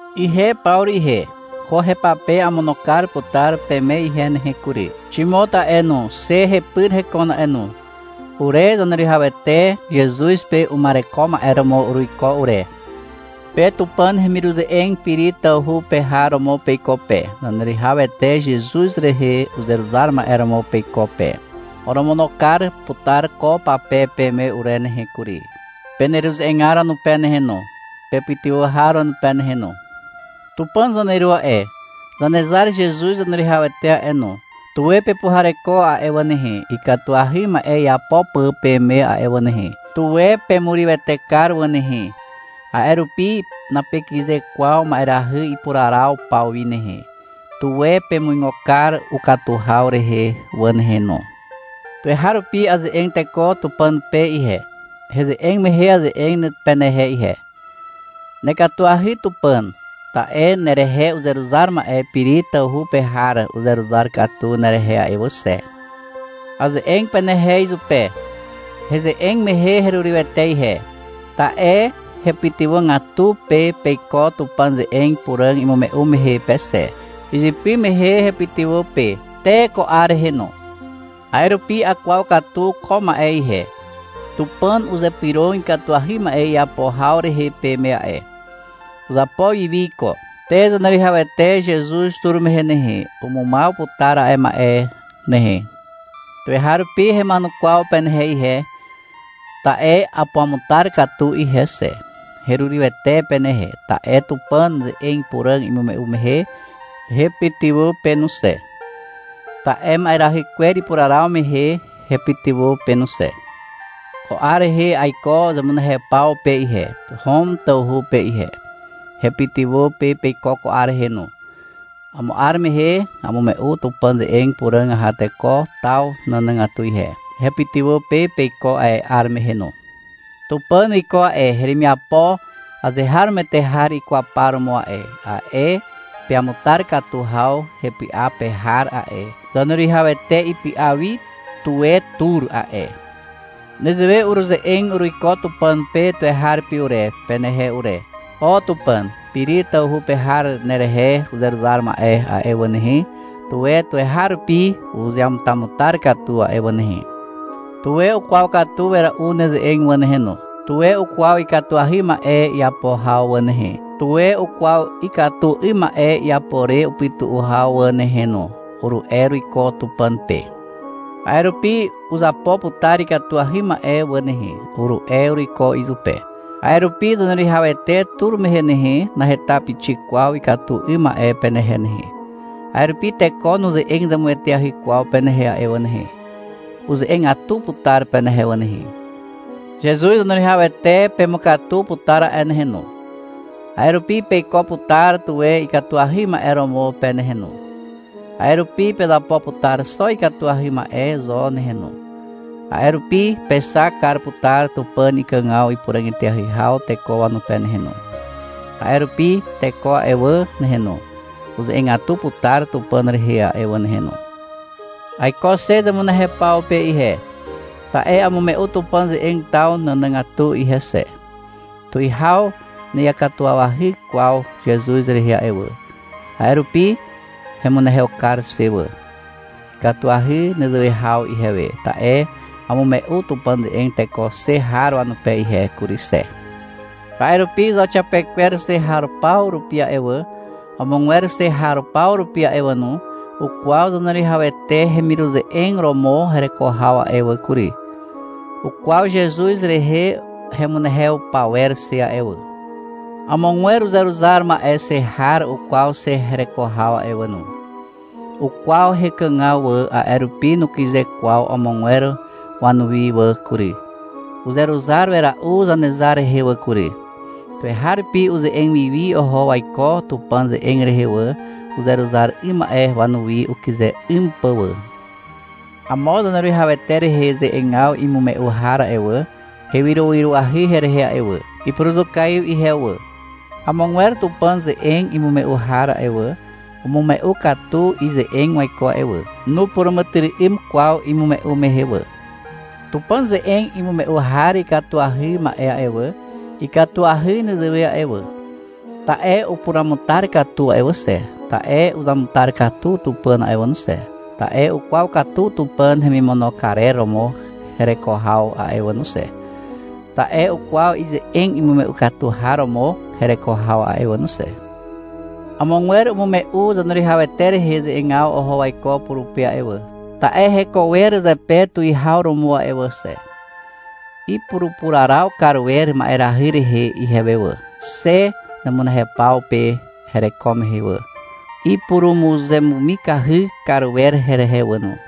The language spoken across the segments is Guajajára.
Ihe Pawru ihe. Ko hepape amono kar putar peme ihe nehe kury. Ximot a'e no, xe hepyr hekon a'e no. Ure Zaneruwihawete Zezuz pe uma'ereko ma'e romo uruiko ure. Pe Tupàn hemiruze'eg Piri tawhu pe har romo peiko pe, Zaneruwihawete Zezuz rehe uzeruzar ma'e romo peiko pe. Oromono kar putar ko pape peme ure nehe kury, peneruze'egar wanupe nehe no, pepytywà har wanupe nehe no. Tupàn zaneru a'e, Zanezar Zezuz Zaneruwihawete a'e no, tuwe pepuhareko a'e wà nehe, ikatuahy ma'e iapo pà peme a'e wà nehe. Tuwe pemurywete kar wà nehe. A'e rupi napekyze kwaw ma'erahy ipuraraw paw wi nehe. Tuwe pemuigo kar ukatu haw rehe wà nehe no. Tuweharupi aze'eg teko Tupàn pe ihe. Heze'eg mehe aze'eg penehe ihe. — Nekatuahy Tupàn, ta'e nerehe uzeruzar ma'e Piri tawhu pe har uzeruzar katu nerehe a'e wà xe. Aze'eg penehe izupe. Heze'eg mehe herurywete ihe. Ta'e hepytywàgatu pe peiko Tupàn ze'eg puràg imume'u mehe pe xe. Izypy mehe hepytywà pe. Te ko 'ar rehe no. A'e rupi akwaw katu ko ma'e ihe. Tupàn uzypyrog ikatuahy ma'e iapo haw rehe peme a'e. Uzapo wiwi iko. Te Zaneruwihawete Zezuz tur mehe nehe, umumaw putar a'e ma'e nehe. Tuweharupi hema'enukwaw penehe ihe. Ta'e apuamutar katu ihe xe. Herurywete penehe, ta'e Tupàn ze'eg puràg imume'u mehe hepytywà pe no xe. Ta'e ma'erahy kwer ipuraraw mehe hepytywà pe no xe. Ko 'ar rehe aiko zemunehew paw pe ihe, Hom tawhu pe ihe. Hepytywà pe peiko ko 'ar rehe no. Amo 'ar mehe amume'u Tupàn ze'eg puràg aha teko taw nànàgatu ihe. Hepytywà pe peiko a'e 'ar mehe no. Tupàn wiko a'e heremiapo azeharomoete har ikwaw par romo a'e, a'e peamutar katu haw hepy'a pe har a'e, Zaneruwihawete ipy'a wi tuwe tur a'e. Nezewe uruze'eg uruiko Tupàn pe tuweharupi ure, penehe ure. — O Tupàn. Piri tawhu pe har nerehe uzeruzar ma'e a'e wà nehe, tuwe tuweharupi uzeamutamutar katu a'e wà nehe. Tuwe ukwaw katu wera'u neze'eg wà nehe no. Tuwe ukwaw ikatuahy ma'e iapo haw wà nehe, tuwe ukwaw ikatu 'ym ma'e iapo re upytu'u haw wà nehe no, uru'e uruiko Tupàn pe. — A'e rupi uzapo putar ikatuahy ma'e wà nehe, uru'e uruiko izupe. A'e rupi Zaneruwihawete tur mehe nehe, naheta pixik kwaw ikatu 'ym ma'e penehe nehe. A'e rupi teko nuze'eg zemueteahy kwaw penehe a'e wà nehe. Uze'egatu putar penehe wà nehe. Zezuz Zaneruwihawete pemukatu putar a'e nehe no. A'e rupi peiko putar tuwe ikatuahy ma'e romo pe nehe no. A'e rupi pezapo putar xo ikatuahy ma'e zo nehe no. A'e rupi pexak kar putar Tupàn ikàgaw ipuràg eteahy haw teko wanupe nehe no. A'e rupi teko a'e wà nehe no, uze'egatu putar Tupàn rehe a'e wà nehe no. Aiko xe zemunehew paw pe ihe, ta'e amume'u Tupàn ze'eg taw nànàgatu ihe xe. Tuwihaw na'iakatuwawahy kwaw Zezuz rehe a'e wà. A'e rupi hemunehew kar xe wà. Ikatuahy nezewe haw ihewe, ta'e amume'u Tupàn ze'eg teko xe har wanupe ihe kury xe. A'e rupi zauxiapekwer xe har paw rupi a'e wà, amogwer xe har paw rupi a'e wà no, ukwaw Zaneruwihawete hemiruze'eg romo hereko haw a'e wà kury. Ukwaw Zezuz rehe hemunehew pawer xe a'e wà. Amogwer uzeruzar ma'e xe har ukwaw xe hereko haw a'e wà no. Ukwaw hekàgaw wà, a'e rupi nukyze kwaw amogwer wanuwi wà kury. Uzeruzar wera'u Zanezar rehe wà kury. Tuweharupi uze'eg wiwi oho waiko Tupàn ze'eg rehe wà, uzeruzar 'ym ma'e wanuwi ukyze 'ym pà wà. Amo Zaneruwihawete rehe ze'egaw imume'u har a'e wà, hewyrowyroahy herehe a'e wà. Ipuruzukaiw ihewe wà. Amogwer Tupàn ze'eg imume'u har a'e wà, umume'u katu ize'eg waiko a'e wà. Nupuràmàtyry'ym kwaw imume'u mehe wà. Tupàn ze'eg imume'u har ikatuahy ma'e a'e wà, ikatuahy nezewe a'e wà, ta'e upuruamutar katu a'e wà xe, ta'e uzamutar katu Tupàn a'e wà no xe, ta'e ukwaw katu Tupàn hemimono karer romo hereko haw a'e wà no xe, ta'e ukwaw ize'eg imume'u katu har romo hereko haw a'e wà no xe. Amogwer umume'u Zaneruwihawete rehe ze'egaw oho waiko purupe a'e wà, ta'e heko wer zepe tuwihaw romo a'e wà xe. Ipurupuraraw kar wer ma'erahy rehe ihewe wà, xe zemunehew paw pe hereko mehe wà. Ipurumuzemumikahy kar wer herehe wà no.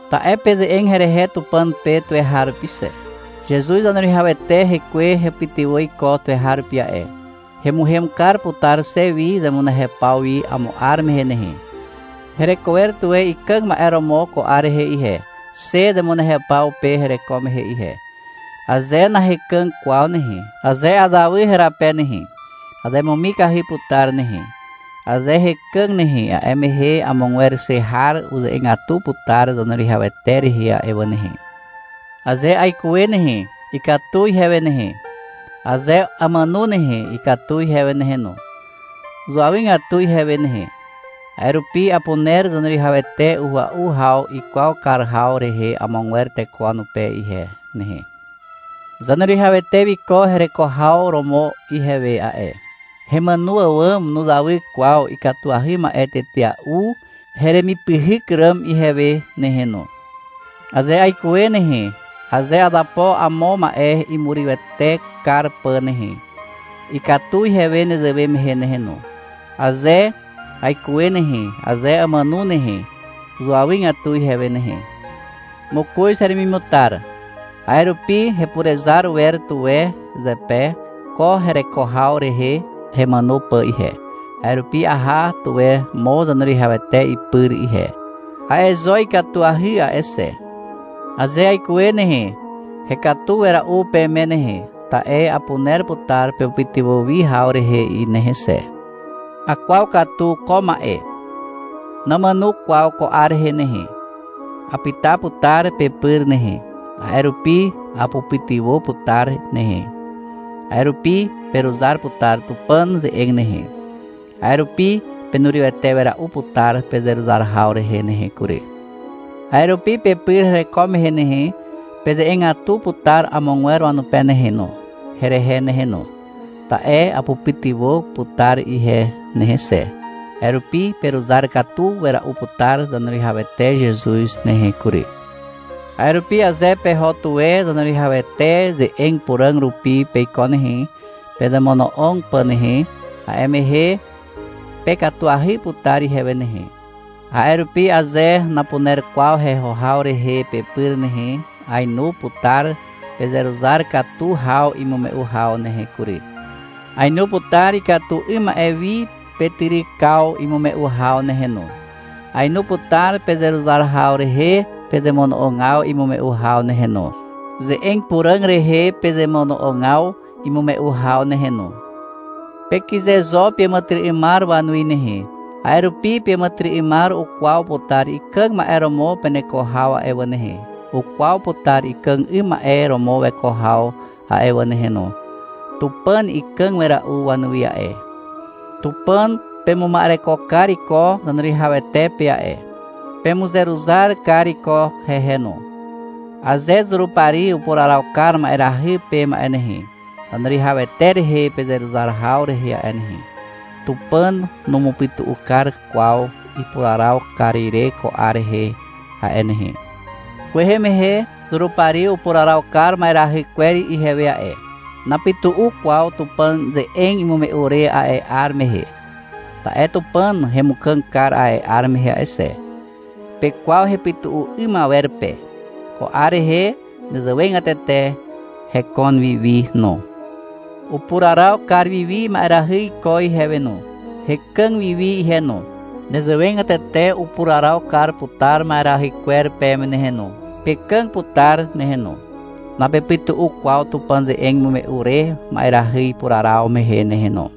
Ta'e peze'eg herehe Tupàn pe tuweharupi xe. Zezuz Zaneruwihawete hekwe hepytywà iko tuweharupi a'e. Hemuhem kar putar xe wi zemunehew paw wi amo 'ar mehe nehe. Hereko wer tuwe ikàg ma'e romo ko 'ar rehe ihe, xe zemunehew paw pe hereko mehe ihe. Aze nahekàg kwaw nehe, aze azawy herape nehe, azemumikahy putar nehe. Aze hekàg nehe, a'e mehe amogwer xe har uze'egatu putar Zaneruwihawete rehe a'e wà nehe. Aze aikuwe nehe, ikatu ihewe nehe. Aze amàno nehe, ikatu ihewe nehe no. Zuawygatu ihewe nehe. A'e rupi apuner Zaneruwihawete uhua'u haw ikwaw kar haw rehe amogwer teko wanupe ihe nehe. Zaneruwihawete wiko hereko haw romo ihewe a'e. Hemàno àwàm nuzawy kwaw ikatuahy ma'e tetea'u heremipyhyk ràm ihewe nehe no. Aze aikuwe nehe, aze azapo amo ma'e imurywete kar pà nehe, ikatu ihewe nezewe mehe nehe no. Aze aikuwe nehe, aze amàno nehe, uzuawygatu ihewe nehe. Mokoz heremimutar. A'e rupi hepurezar wer tuwe zepe ko hereko haw rehe hemàno pà ihe, a'e rupi aha tuwe mo Zaneruwihawete ipyr ihe. A'e zo ikatuahy a'e xe. Aze aikuwe nehe, hekatu wera'u peme nehe, ta'e apuner putar pepytywà wi haw rehe nehe xe. Akwaw katu ko ma'e. Namàno kwaw ko 'ar rehe nehe. Apyta putar pepyr nehe. A'e rupi apupytywà putar nehe. A'e rupi peruzar putar Tupàn ze'eg nehe. A'e rupi penurywete wera'u putar pezeruzar haw rehe nehe kury. A'e rupi pepyr hereko mehe nehe, peze'egatu putar amogwer wanupe nehe no, herehe nehe no. Ta'e apupytywà putar ihe nehe xe. A'e rupi peruzar katu wera'u putar Zaneruwihawete Zezuz nehe kury. A'e rupi aze peho tuwe Zaneruwihawete ze'eg puràg rupi peiko nehe, pezemono'og pà nehe, a'e mehe pekatuahy putar ihewe nehe. A'e rupi aze napuner kwaw heho haw rehe pepyr nehe, ainu putar pezeruzar katu haw imume'u haw nehe kury. Aenu putar ikatu 'ym ma'e wi petyrykaw imume'u haw nehe no. Aenu putar pezeruzar haw rehe pezemono'ogaw imume'u haw nehe no, ze'eg puràg rehe pezemono'ogaw imume'u haw nehe no. Pekyze zo peàmàtyry'ymar wanuwi nehe. A'e rupi peàmàtyry'ymar ukwaw putar ikàg ma'e romo peneko haw a'e wà nehe, ukwaw putar ikàg 'ym ma'e romo weko haw a'e wà nehe no. Tupàn ikàg wera'u wanuwi a'e. Tupàn pemuma'ereko kar iko Zaneruwihawete pe a'e. Pemuzeruzar kar iko hehe no. Aze Zurupari upuraraw kar ma'erahy peme a'e nehe, Zaneruwihawete rehe pezeruzar haw rehe a'e nehe, Tupàn numupytu'u kar kwaw ipuraraw kar ire ko 'ar rehe a'e nehe. Kwehe mehe Zurupari upuraraw kar ma'erahy kwer ihewe a'e. Napytu'u kwaw Tupàn ze'eg imume'u re a'e 'ar mehe. Ta'e Tupàn hemukàg kar a'e 'ar mehe a'e xe. Pekwaw hepytu'u 'ym awer pe. Ko 'ar rehe nezewegatete hekon wiwi no. Upuraraw kar wiwi ma'erahy iko ihewe no. Hekàg wiwi ihe no. Nezewegatete upuraraw kar putar ma'erahy kwer peme nehe no. Pekàg putar nehe no. Napepytu'u kwaw Tupàn ze'eg imume'u re ma'erahy ipuraraw mehe nehe no.